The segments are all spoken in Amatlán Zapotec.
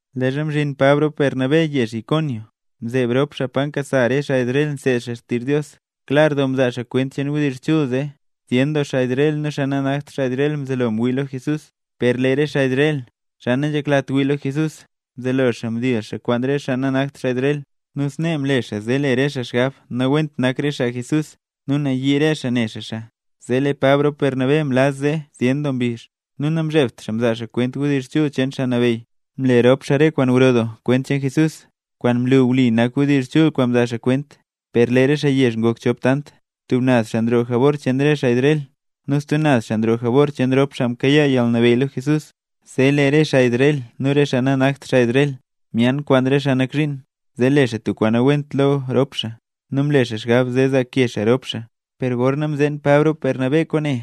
Leezha mzhin Pab rop Bernabé yezh Iconio, mzeeb rop xaa pa nkasa xaa Israel nseed xaa xtizh Dios, klar doo mzaa xaa kwent cheen wdizh chul zee zyen doo xaa Israel nu xaa nanakt xaa Israel mzelo ngwii lo Jesús. Per lee re xaa Israel, xaa nanzheklat wii lo Jesús, mzelo xaa mdiizh xaa kwaan re xaa nanakt xaa Israel, nu snee mle xaa zee le re xaa xgab nawent nak re xaa Jesús nu nayii re xaa ne xaa xaa. Zee lee Pab rop Bernabé mlaz zee zyen doo mbizh, nu namzhebt xaa mzaa xaa kwent wdizh chul cheen Xaa Nabeyy. Mle rop xaa re kwaan gro doo kwent cheen Jesús, kwaan mlu wli nak wdizh chul kwaan mzaa xaa kwent. Per lee re xaa yezh ngok chop tant, tub naz xaa nroo jabor cheen re xaa Israel nu stub naz xaa nroo jabor cheen rop xaa mkayaa yalnabeyy lo Jesús. Zee lee re xaa Israel nu re xaa nanakt xaa Israel myaan kwaan re xaa nak zhiin, zee le xaa tub kwaan nawent lo rop xaa nu mle xaa xgab zee zaake xaa rop xaa. Per gorna mzeen Pab rop Bernabé kwaane,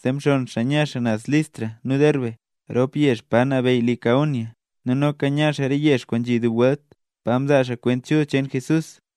zee mxonn xaa nya xaa naz Listra nu Derbe, rop yezh pa nabeyy Licaonia, nu noka nya xaa re yezh kwaan nzhi dub welt, pa mzaa xaa Kwent Chul cheen Jesús.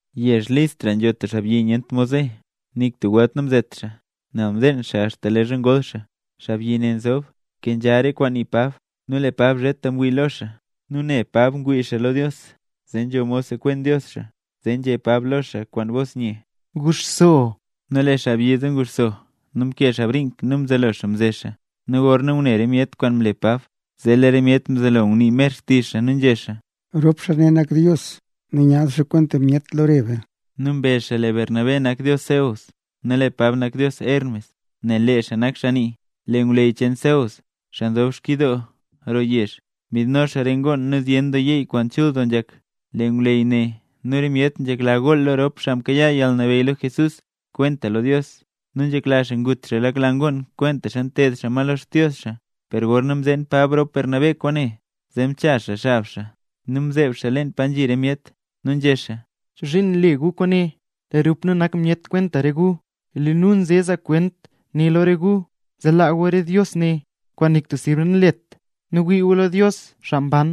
Yezh Listra nzho tub xaabyi nyent mod ze. Nik tub welt namzet xaa, nel mdeen xaa axta leezha ngol xaa. Xaabyi ne nzob, nkenzha re kwaan nii Pab, nu lee Pab zheta mwii lo xaa nu ne Pab ngwii xaa lo Dios, zee nzho mod sekwen Dios xaa. Zee nzhé Pab lo xaa kwaan bos nye: —¡Guxso! Nu lee xaabyi zee nguxso nu mkee xaa brink nu mzelo xaa mze xaa. Nu gorna ngune re myet kwaan mle Pab, zee lee re myet mzelo ngunii mer xtizh xaa nu nzhé xaa: —¡Rop xaa ne nak dios nu myaad xaa kwenta myet lo re be! Nu mbezh xaa lee Bernabé nak dios Zeus, nu lee Pab nak dios Hermes, nel lee xaa nak xaa nii. Lee ngwleyy cheen Zeus, xaa nzob xkyidoo roo yezh, mbidno xaa re ngoon nu zyen yeey kwaan chul nzhak. Lee ngwleyy nu re myet nzhekla gool xaa lo rop xaa mkayaa yalnabeyy lo Jesús kwentaxa lo Dios, nu nzhekla xaa ngut xaa lak la ngoon kwentaxa nteed xaa ma lo xdios xaa. Per gorna mzeen Bernabé rop Pab kwaane, zee mchaz xaa xab xaa nu mzeeb xaa leen pa nzhi re myet, nu nzhé xaa: —¿Chozhiin nle gu kwaane? Lee rop nu nak myet kwenta re gu. Lee nu nze zaa kwent ne lo re gu, zee laa gu re dios ne, kwaan nik tub sirb nanlet, nu wii gu lo Dios, xaa mban.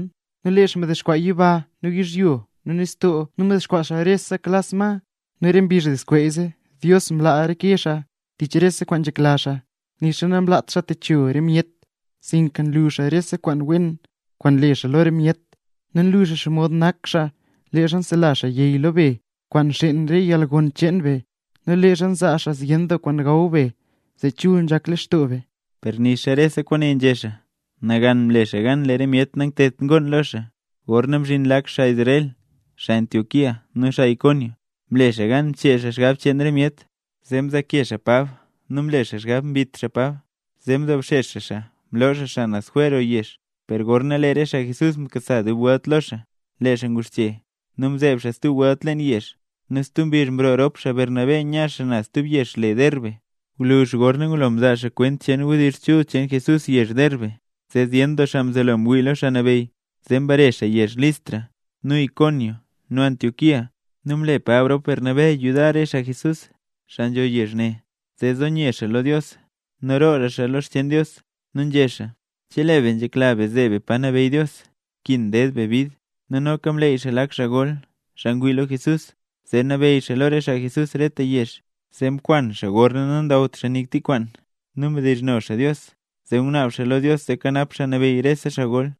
Lee xaa mdexkwaa yiba nu yizhyo nu nistoo nu mdexkwaa xaa re naksa ma. Nu re mbizh nazskweeze, Dios mlaa reke xaa tich re kwaan nzhekla xaa, nixa namlaat xaa techo re myet sinka nlu xaa rese kwaan wen kwaan nle xaa lo re myet. Nlu xaa xomod nak xaa leezha nselazh yey lo be kwaan nxeen re yalgon cheen be, nu leezha nzaa xaa zyen kwaan gaw be zee chul nzhak lextoo be. Per nixa rese kwaane nzhé xaa, nagan mle xaa gan lee re myet nangteedt ngoon lo xaa. Gorna mzhin lak xaa Israel, xaa Antioquía nu xaa Iconio, mle xaa gan mchee xaa xgab cheen re myet; zee mzaake xaa Pab nu mle xaa xgab mbit xaa Pab, zee mdobxex xaa xaa mloo xaa xaa naz jwer roo yezh. Per gorna lee re xaa Jesús mkasa dub welt lo xaa, lee xaa nguxche nu mzeeb xaa stub welt leen yezh. Nu stub mbizh mroo rop xaa Bernabé nya xaa naz stub yezh le Derbe. Gwluzh gorna ngulo mzaa xaa kwent cheen wdizh chul cheen Jesús yezh Derbe, zee zyen doo xaa mzelo ngwii lo Xaa Nabeyy. Zee mbare xaa yezh Listra, nu Iconio nu Antioquía. Nu mle Pab rop Bernabé yudar re xaa Jesús, xaa nzho yezh ne, zee zo nye xaa lo Dios nu roora xaa lo re xcheen Dios. Nu nzhé xaa: “Chelee be nzhekla be zeeb be pa nabeyy Dios nkin ded be bid”. Nu noka mleey xaa lak xaa gol, xaa ngwii lo Jesús, zee nabeyy xaa lo re xaa Jesús reta yezh. Zee mkwan xaa gorna nandawt xaa nik tik kwaan nu mdizhno xaa Dios, zee ngunaab xaa lo Dios zee kanap Xaa Nabeyy rese xaa gol.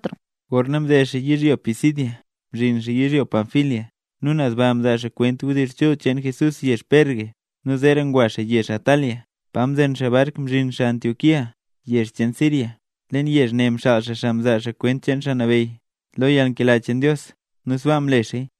Gorna mded xaa yizhyo Pisidia, mzhin xaa yizhyo Panfilia, nu naz baa mzaa xaa kwent wdizh chul cheen Jesús yezh Perge. Nu zeera ngwa xaa yezh Atalia, pa mzen xaa bark mzhin xaa Antioquía, yezh cheen Siria. Leen yezh ne mxaal xaa xaa mzaa xaa kwent cheen Xaa Nabeyy, lo yalnkela cheen Dios. Nu sbaa mle xaaya.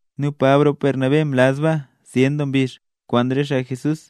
Nu Pab rop Bernabé mlaz baa zyen doo mbizh kwaan re xaa Jesús.